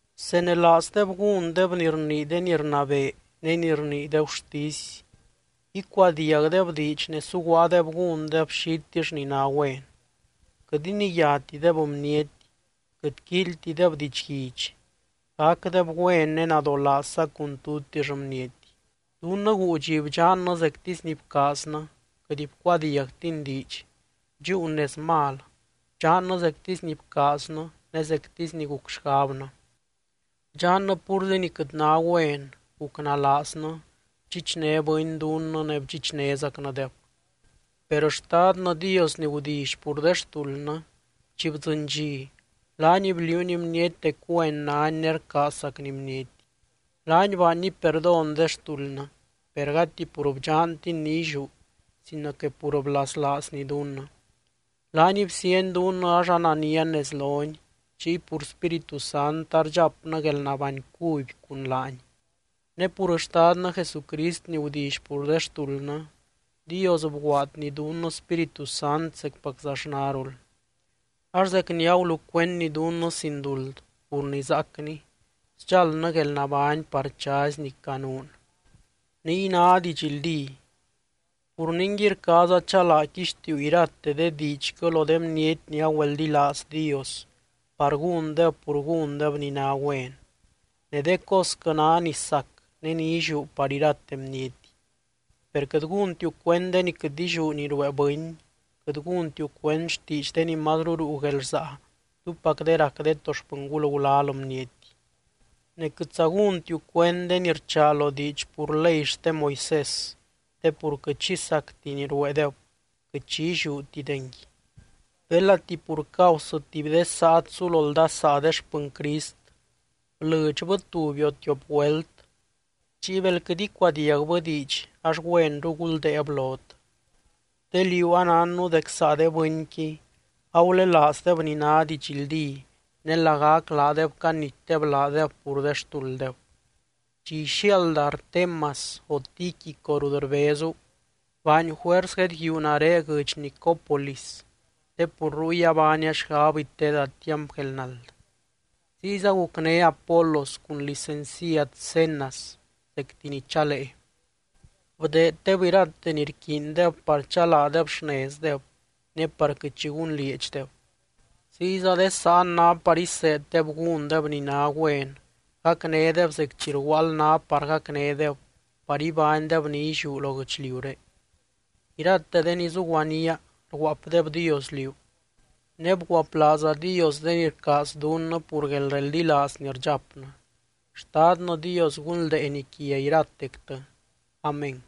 Bsenelaazdeb gúndeb ni rnii de ni rnabee ne ni rnii de gurtisy, icuadiagdeb diidx ne suguaadeb gúndeb xitill ni ná güen. Quɨt iniyátideb bniety, quɨt quíilytideb didxguidx, gacdeb güen ne nadolaazza cun tutix bniety. Dunnɨ guu dxi bdxannɨ zectisy ni bcaaznɨ, quɨt bcuadiagtin diidx, bdxúun nez mal, bdxannɨ zectisy ni bcaaznɨ ne zectisy ni guc xgabnɨ. Bdxannɨ púrzi ni quɨt ná güen, gucnalaaznɨ, bdxichné bɨny dunnɨ ne bdxichnézacnɨdeb. Per Xtadnɨ Dios ni gudilly pur de xtuldnɨ, chi bdzɨny dxi, laany bliuuny bniety dec güen nány ne rcaazzacny bniety. Laany baanny perdón de xtuldnɨ, per gati pur bdxantin ni illiú sino que pur blaslaazny dunnɨ. Laany bsiany dunnɨ ax ananian nez lony, chiy pur Spíritu Sant ardxapnɨ guelnabány cuby cun laany. Ne pur Xtadnɨ Jesucrist ni gudilly pur de xtuldnɨ, Dios bguaadny dunnɨ Spíritu Sant zecpaczaxnarul. Ax zec ni agulucuendny dunnɨ sin duld pur ni zaacny, sdxáldnɨ guelnabány par chazy ni canuun. Niy ná didxldí. Pur ningui, rcaaza chalaa quixtiiu irate de diidxquɨ lo de bniety ni agüeldilaaz Dios par gúndeb pur gúndeb ni ná güen. Ne de cosquɨ ná ni sac ne ni illiú par irate bniety. Per quɨt gúntiu cuend de ni quɨt illiú ni ruee bɨny, quɨt gúntiu cuend xtiidx de ni mazru ruu guelrsaa túpac de rac de to xpɨngul gulal bniety. Ne quɨtza gúntiu cuend de ni rchaa lo diidx pur ley xte Moisés, te pur quɨt xi sacti ni rueedeb, quɨt xi illiútidengui. Belati pur causɨ tuby de saat sulo ldasaa de xpɨny Crist, blɨdxbɨ tuby o tiop güelt, chiy bel quɨt icuadiagbɨ diidx ax güenru guldéeb lot. Te liú anánnu dec saa de bɨnqui agulelaazdeb ni ná didxldí ne lagac laadeb canitdeb laadeb pur de xtulddeb. Chi ixiaalda Artemas o Tíquico rut rbezu, baany juers guedguíu nare guɨdx Nicópolis, te pur ruy abaania xgab iteeda tiamp guelnald. Ziyza gucné Apolos cun licenciad Zenas zecti ni chalee. Bdeeddeb irate ni rquiindeb par chalaadeb xnezdeb ne par quɨt xi gunlieedxdeb. Ziyza de sáan ná par iseeddeb gúndeb ni ná güen, gacnédeb zec chi rguaald ná par gacnédeb par ibánydeb ni illiú lo guɨchliuré. Irate de ni zuguaníaa rguaapdebdios liú. Ne bguaplaazadios de ni rcaaz dunnɨ pur guelreldilaaz ni rdxapnɨ. Xtadnɨ Dios gunldeeny quia iratectɨ. Amén.